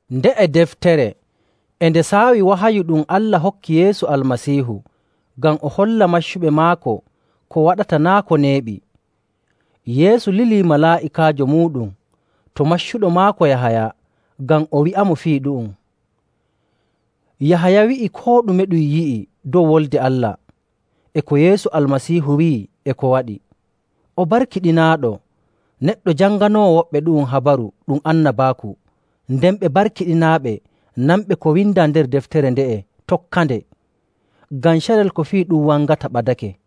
Nde'e deftere e nde saawi wahayu ɗum Allah hokki Yeesu Almasiihu ngam o holla maccuɓe maako ko waɗata naa' ko neeɓi. Yeesu lili malaa'ikaajo muuɗum to maccuɗo maako Yahaya ngam o wi'amo fii ɗum. Yahaya wi'i koo ɗume ɗum yi'i dow Wolde Allah, e ko Yeesu Almasiihu wi'i e ko waɗi. O barkiɗinaaɗo neɗɗo janganoowo woɓɓe ɗu'um habaru ɗum annabaaku, nden ɓe barkiɗinaaɓe nanɓe ko windaa nder deftere nde'e tokkande, ngam carel ko fii ɗum wangata ɓadake.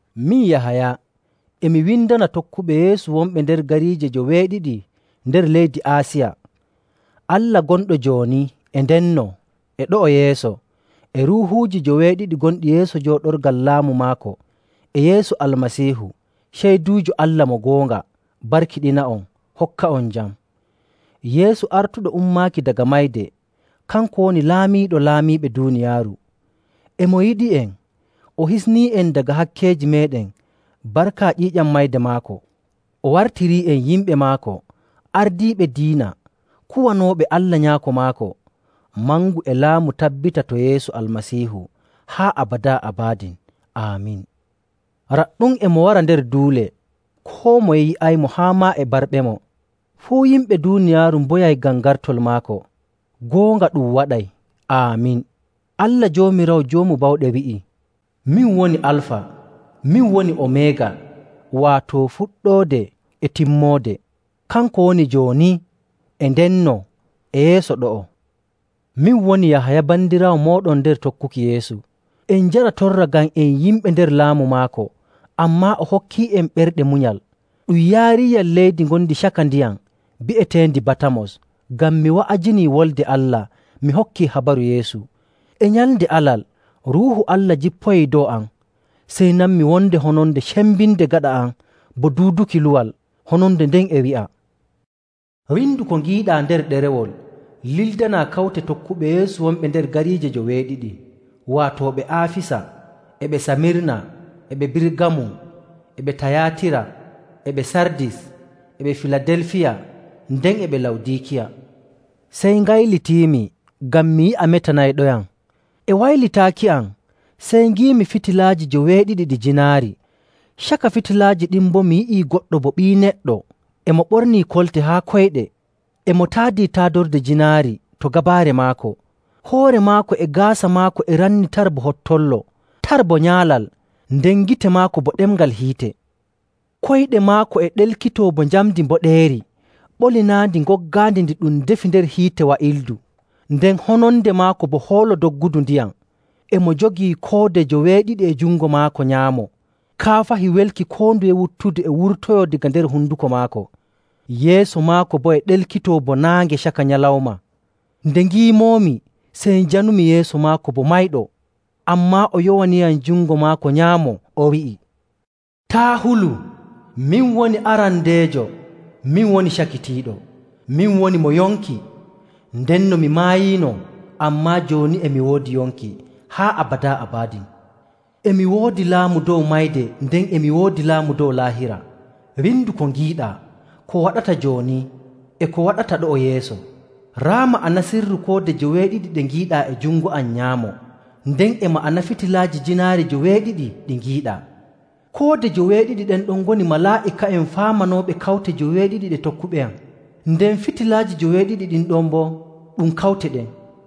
Min Yahaya e mi windana tokkuɓe Yeesu wonɓe nder gariije joweeɗiɗi nder leydi Aasiya. Allah gonɗo jooni e ndenno e ɗo'o yeeso, e Ruuhuuji joweeɗiɗi gonɗi yeeso jooɗorgal laamu maako, e Yeesu Almasiihu, ceyduujo Allah mo goonga, barkiɗina'on, hokka'on jam. Yeesu artuɗo ummaaki daga mayde kanko woni laamiiɗo laamiiɓe duuniyaaru. E mo yiɗi'en, o hisnii'en daga hakkeeji meeɗen barka ƴiiƴam mayde maako. O wartirii'en yimɓe maako ardiiɓe diina kuwanooɓe Allah Nyaako maako. Mangu e laamu tabbita to Yeesu Almasiihu haa abadaa abadin. Aamin. Raɗɗum e mo wara nder duule, koo moye yi'aymo haa maa e barɓemo. Fuu yimɓe duuniyaaru mboyay ngam gartol maako! Goonga, ɗum waɗay. Aamin. Allah Joomiraawo Joomu Bawɗe wi'i, “Min woni Alfa, min woni Omeega,” waato Fuɗɗoode e Timmoode. Kanko woni jooni, e ndenno, e yeeso ɗo'o. Min woni Yahaya bandiraawo mooɗon nder tokkuki Yeesu. En njara torra ngam en yimɓe nder laamu maako, ammaa o hokkii'en ɓerɗe munyal. Ɗum yaariiyam leydi ngondi caka ndiyam bi'eteendi Batamos ngam mi wa'ajinii Wolde Allah mi hokkii habaru Yeesu. E nyalnde Alal, Ruuhu Allah jippoyii dow am, sey nanmi wonde hononde cembinde gaɗa am bo duuduki luwal. Hononde nden e wi'a, “Windu ko ngiiɗaa nder ɗerewol lildanaa kawte tokkuɓe Yeesu wonɓe nder gariije joweeɗiɗi, waato ɓe Aafisa, e ɓe Samirna, e ɓe Birgamum, e ɓe Tayaatira, e ɓe Sardis, e ɓe Filadelfiya, nden e ɓe Lawdiikiya.” Sey ngaylitiimi ngam mi yi'a metanayɗoyam. E waylitaaki am sey ngiimi fitilaaji joweeɗiɗi ɗi jiinaari. Caka fitilaaji ɗin boo mi yi'i goɗɗo bo Ɓii Neɗɗo e mo ɓornii kolte haa koyɗe, e mo taadii taadorde jiinaari to gabaare maako. Hoore maako e gaasa maako e ranni tar bo hottollo, tar bo nyaalal, nden gite maako bo ɗemngal hiite. Koyɗe maako e ɗelkitoo bo njamndi mboɗeeri ɓolinaandi ngoggaandi ndi ɗum defi nder hiite wa'ildu, nden hononde maako bo hoolo doggudu ndiyam. E mo jogii koode joweeɗiɗi e jungo maako nyaamo, kaafahi welki koo nduye wuttudu e wurtoyoo daga nder honduko maako. Yeeso maako boo e ɗelkitoo bo naange caka nyalawma. Nde ngiimoomi, sey njanumi yeeso maako bo mayɗo. Ammaa o yowaniyam jungo maako nyaamo o wi'i, “Taa' hulu. Min woni arandeejo, min woni cakitiiɗo. Min woni mo yonki! Ndenno mi maayiino. Ammaa jooni e mi woodi yonki haa abadaa abadin, e mi woodi laamu dow Mayde nden e mi woodi laamu dow Laahira. Windu ko ngiiɗaa, ko waɗata jooni, e ko waɗata ɗo'o yeeso. Raa ma'ana sirru koode joweeɗiɗi ɗe ngiiɗaa e jungo am nyaamo, nden e ma'ana fitilaaji jiinaari joweeɗiɗi ɗi ngiiɗaa: koode joweeɗiɗi ɗen ɗon ngoni malaa'ika'en faamanooɓe kawte joweeɗiɗi ɗe tokkuɓeyam, nden fitilaaji joweeɗiɗi ɗin ɗon boo ɗum kawte ɗen.”